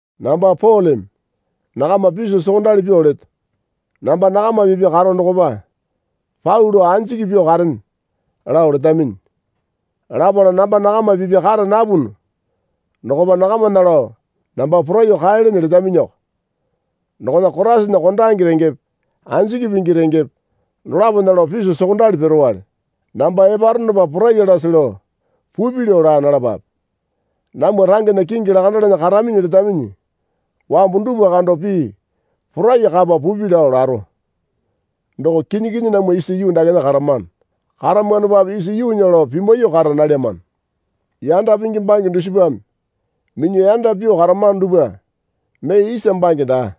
Namba Poleme nakama piso sokondali pyuo leto. Namba nakama pipya karo dokopa pau lao anjiki pyuo karene lao letaminyi. Lapala namba nakama pipya kara napunu dokopa nakamana lao namba poraiyuo kaelene letaminyiko. Dokona Koraisana kondange rengepe anjiki pingi rengepe dolapona lao piso sokondali piruwale. Namba eparonopa poraiyalase lao pupi lao laa nalapape. Namwa rangena kingi lakandalana karaminyi letaminyi wambu dupwa kando pii porai kapa pupi lao laro. Doko kinyi kinyi namwa isa yuu dakena karamano. Karamanopape isa yuunya lao pimwaiyuo kara nalyamano. Yanda pingi bange dusipame minyuo yanda pyuo karamano dupwa mee isa bange daa.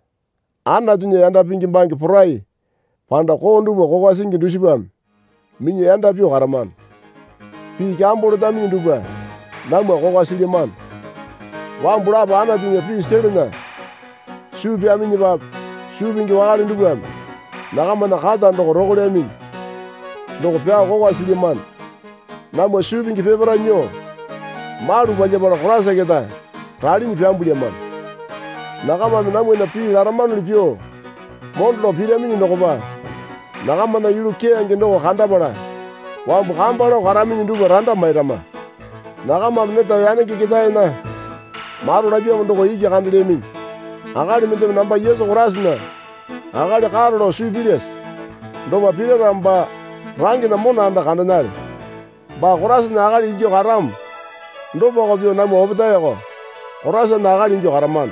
Anatunya yanda pingi bange porai panda koo dupwa kokwa singi dusipame minyuo yanda pyuo karamano. Pii kyambo letaminyi dupwa namwa kokwa silyamano. Wambu lapo Anatunya pii selana suu pyaminyipape suu pingi wakale dupwame nakamana kata doko rokolyaminyi. Doko pyao kokwa silyamano. Namwa suu pingi peparae nyuo malu palyapala Koraisa keta ralinyi pyambulyamano. Nakamame namwana pii laramanuli pyuo mondo lao piraminyi dokopa nakamana yulu keyange doko kandapala wambu kamba lao karaminyi dupwa randa mairama. Nakamame neta yanenge ketaena maro lapyamo doko iki kandelyaminyi. Akali mendeme namba Yesu Koraisana akali karo lao suu pilyase? Dopa pira ramo baa rangena mona anda kandenale. Baa Koraisana akali ingyuo karamo dopako pyuo namwa opetaeko Koraisana akali ingyuo karamano.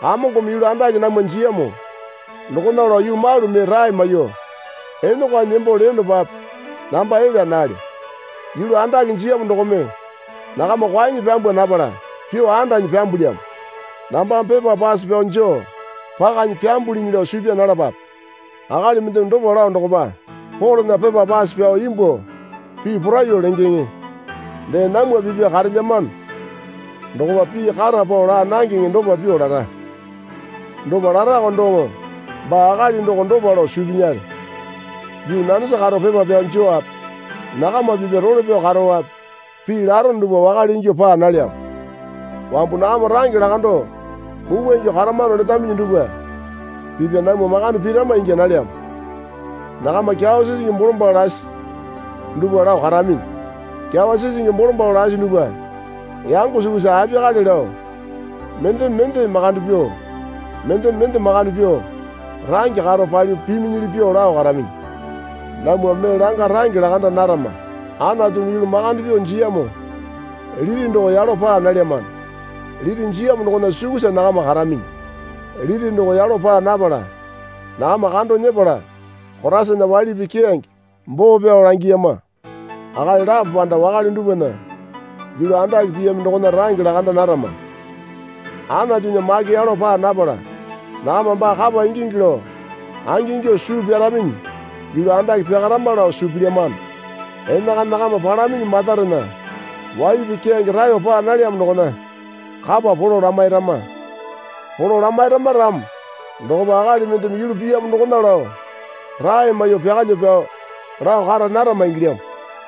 Kamongome yulu andake namwa jiyamo dokona lao yuu malu mee rae maiyuo enokwanyi nembo leyonopape namba elya nalyo. Yulu andake jiyamo dokome nakama kwaenyi pyambwa napala pyuo andanyi pyambulyamo. Nambame pepa pase pyao joo pakanyi pyambulinyi lao suu pyaa nalapape. Akali mendeme dopa lao dokopa, Polena pepa pase pyao imbuo pii poraiyuo lengeŋe, dee namwa pipya karelyamo dokopa pii kata pao laa nangeŋe dopa pyuo lara. Dopa larako doŋo baa akali doko dopa lao suu pinyale. Yuu nanesa karo pepa pyao jowape nakama pipya role pyao karowape pii larono dupwa wakale ingyuo paa nalyamo. Wambu nakama range lakando mupwa ingyuo karamano letaminyi dupwa pipya namwa makande pirama ingya nalyamo. Nakama kyawa sisingi bolombalo lasi dupwa lao karaminyi. Kyawa sisingi bolombalo lasi dupwa yango sukusa apiyakale lao mendeme mende makande pyuo mendeme mende makande pyuo range karo palyuo piminyili pyuo lao karaminyi. Namwa mee langa range lakanda narama. Anatumi yulu makande pyuo jiyamo liti doko yalo paa nalyamano liti jiyamo dokona sukusa nakama karaminyi. Liti doko yalo paa napala nakama kando nyepala Koraisana waili pii keyange boo pyao langiyama. Akali lapo panda wakale dupwana yulu andake piyami dokona range lakanda narama. Anatunya make yalo paa napala nakama baa kapa ingingi lao angingyuo suu pyaraminyi yulu andake pyakarama lao suu pilyamano. Enakana nakama palaminyi matarena waili pii keyange raeyo paa nalyamo dokona kapa polo lamairama. Polo lamairama ramo dokopa akali mendeme yulu piyamo dokona lao rae maiyuo pyakalyuo pyao lao kara narama ingilyamo.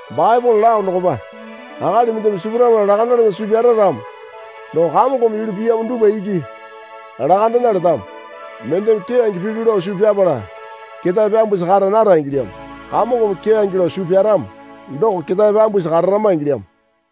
Baepole lao dokopa, Akali mendeme sipurapala lakandalana suu pyara ramo doko Kamongome yulu piyamo dupwa iki lakandena letamo. Mendeme keyange pilyu lao suu pyapala ketae pyambusi kara nara ingilyamo. Kamongome keyange lao suu pyaramo doko ketae pyambusi kararama ingilyamo.